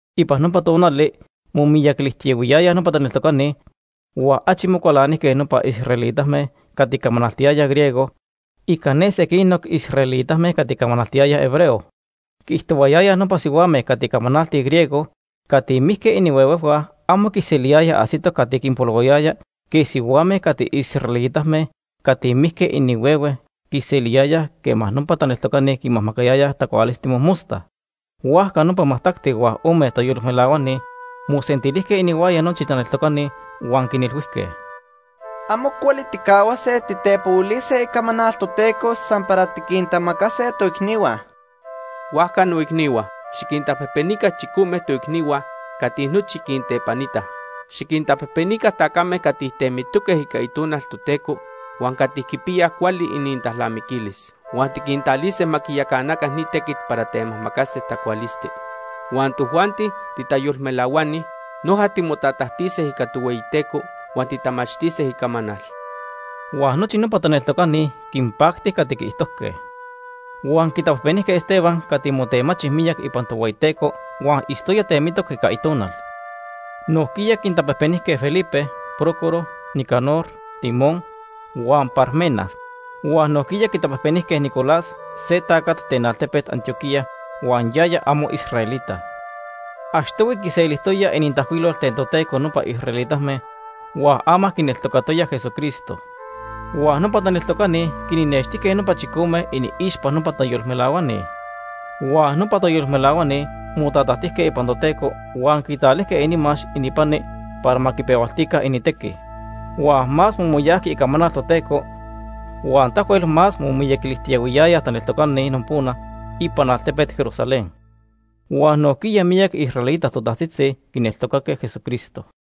Ipan nopa tonali momiyaquilijtiyahuiyayaj nopa taneltocani huan achi mocualanijque nopa israelitame cati camanaltiyayaj griego ica ne sequinoc israelitame cati camanaltiyayaj hebreo. Quiijtohuayayaj nopa sihuame cati camanaltij griego cati mijque inihuehue amo quiseliyayaj ajsitoc cati quinpolohuayaya quej sihuame cati israelitame cati mijque inihuehue quiseliyayaj quema nopa taneltocani quinmajmacayayaj tacualisti mojmosta. Huajca nopa majtacti huan ome tayolmelahuani mosentilijque inihuaya nochi taneltocani huan quinilhuijque: ―Amo cuali tijcahuase titepohuilise Icamanal Toteco san para tiquintamacase toicnihua. Huajca, noicnihua, xiquintapejpenica chicome toicnihua cati nochi quintepanitaj. Xiquintapejpenica tacame cati temitoque ica Itonal Toteco huan cati quipiyaj cuali inintalnamiquilis. Huan tiquintalise ma quiyacanaca ni tequit para temajmacase tacualisti. Huan tojuanti titayolmelahuani, noja timotatajtise ica Tohueyiteco huan titamachtise Icamanal. Huan nochi nopa taneltocani quinpacti cati quiijtojque. Huan quitapejpenijque Esteban cati motemachi miyac ipan Tohueyiteco huan itztoya temitoc ica Itonal. Nojquiya quintapejpenijque Felipe, Prócoro, Nicanor, Timón huan Parmenas. Huan nojquiya quitapejpenijque Nicolás se tacat ten altepet Antioquía huan yaya amo israelita. Achtohui quiselijtoyaj inintajcuilol ten Toteco nopa israelitame huan ama quineltocatoya Jesucristo. Huan nopa taneltocani quinnextijque nopa chicome iniixpa nopa tayolmelahuani. Huan nopa tayolmelahuani motatajtijque ipan Toteco huan quitalijque inimax ininpani para ma quipehualtica inintequi. Huan más momoyajqui icamanal Toteco huan tahuel más momiyaquilijtiyahuiyayaj taneltocani nopona ipan altepet Jerusalén. Huan nojquiya miyac israelita totajtzitzi quineltocaque Jesucristo.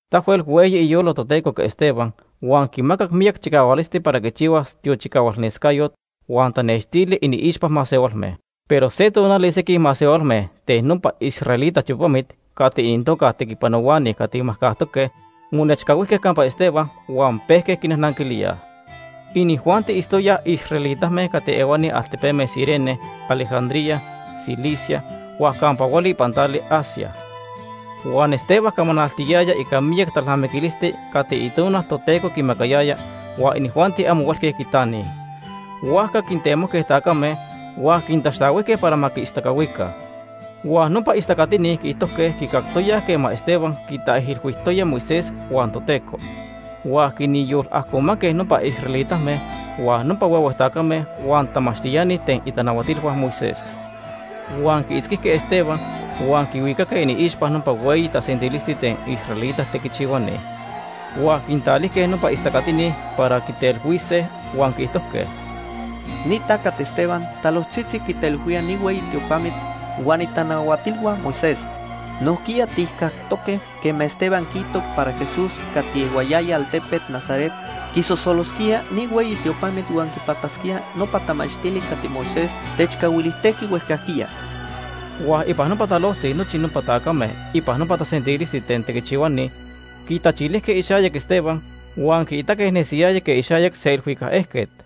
Tahuel hueyi iyolo Toteco ica Esteban huan quimacac miyac chicahualisti para quichihuas tiochicahualnescayot huan tanextili iniixpa masehualme. Pero se tonali sequij masehualme ten nopa israelita tiopamit cati inintoca Tequipanohuani Cati Majcajtoque monechcahuijque campa Esteban huan pejque quinajnanquilíaj. Inijuanti itztoyaj israelitame cati ehuani altepeme Cirene, Alejandría, Cilicia huan campa hueli ipan tali Asia. Huan Esteban camanaltiyaya ica miyac talnamiquilisti cati Itonal Toteco quimacayaya huan inijuanti amo huelque quitanij. Huajca quintemojque tacame huan quintaxtahuijque para ma quiistacahuica. Huan nopa istacatini quiijtojque quicactoyaj quema Esteban quintaijilhuijtoya Moisés huan Toteco. Huan quinyolajcomanque nopa israelitame, huan nopa huehue tacame huan tamachtiani ten itanahuatilhua Moisés. Huan quiitzquijque Esteban huan quihuicaque iniixpa nopa hueyi tasentilisti ten israelita tequichihuani. Huan quintalijque nopa istacatini para quitelhuise huan quiijtojque: ―Ni tacat Esteban talojtzitzi quitaijilhuía ni hueyi tiopamit huan itanahuatilhua Moisés. Nojquiya tijcactoque quema Esteban quiijto para Jesús cati ehuayaya altepet Nazaret quisosolosquía ni hueyi tiopamit huan quipatasquía nopa tamachtili cati Moisés techcahuilijtejqui huejcajquiya. Huan ipan nopa talojtzi nochi nopa tacame ipan nopa tasentilisti ten tequichihuani quitachilijque ixayac Esteban huan quiitaque nesiyaya quej ixayac se ilhuicac ejquet.